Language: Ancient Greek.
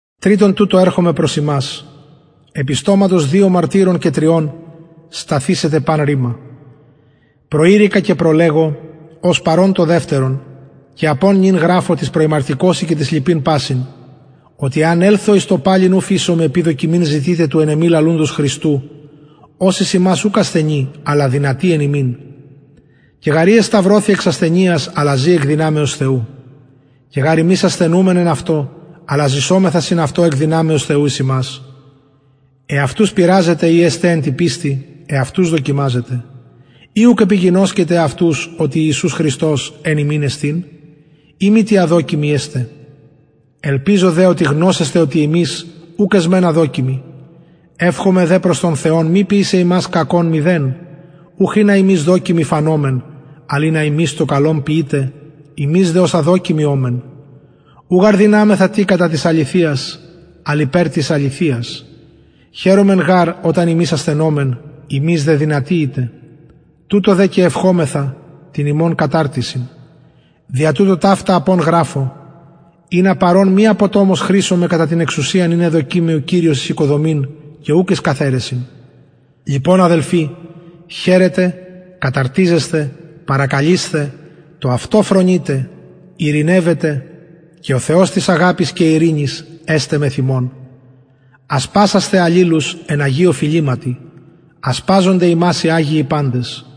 τριτον τουτο ερχομαι προς υμας επι στοματος δυο μαρτυρων και τριων σταθησεται παν ρημα προειρηκα και προλεγω ως παρων το δευτερον και απων νυν γραφω τοις προημαρτηκοσιν και τοις λοιποις πασιν οτι εαν ελθω εις το παλιν ου φεισομαι επει δοκιμην ζητειτε του εν εμοι λαλουντος χριστου ος εις υμας ουκ ασθενει αλλα δυνατει εν υμιν και γαρ ει εσταυρωθη εξ ασθενειας αλλα ζη εκ δυναμεως θεου και γαρ ημεις ασθενουμεν εν αυτω αλλα ζησομεθα συν αυτω εκ δυναμεως θεου εις υμας εαυτους πειραζετε ει εστε εν τη πιστει εαυτους δοκιμαζετε η ουκ επιγινωσκετε εαυτους οτι ιησους χριστος εν υμιν εστιν ει μη τι αδοκιμοι εστε ελπιζω δε οτι γνωσεσθε οτι ημεις ουκ εσμεν αδοκιμοι ευχομαι δε προς τον θεον μη ποιησαι υμας κακον μηδεν ουχ ινα ημεις δοκιμοι φανωμεν αλλ ινα υμεις το καλον ποιητε ημεις δε ως αδοκιμοι ωμεν ου γαρ δυναμεθα τι κατα της αληθειας αλλ υπερ της αληθειας χαιρομεν γαρ οταν ημεις ασθενωμεν υμεις δε δυνατοι ητε τουτο δε και ευχομεθα την υμων καταρτισιν δια τουτο ταυτα απων γραφω ινα παρων μη αποτομως χρησωμαι κατα την εξουσιαν ην εδωκεν μοι ο κυριος εις οικοδομην και ουκ εις καθαιρεσιν λοιπον αδελφοι χαιρετε καταρτιζεσθε παρακαλεισθε το αυτο φρονειτε ειρηνευετε και ο θεος της αγαπης και ειρηνης εσται μεθ υμων ασπασασθε αλληλους εν αγιω φιληματι ασπαζονται υμας οι αγιοι παντες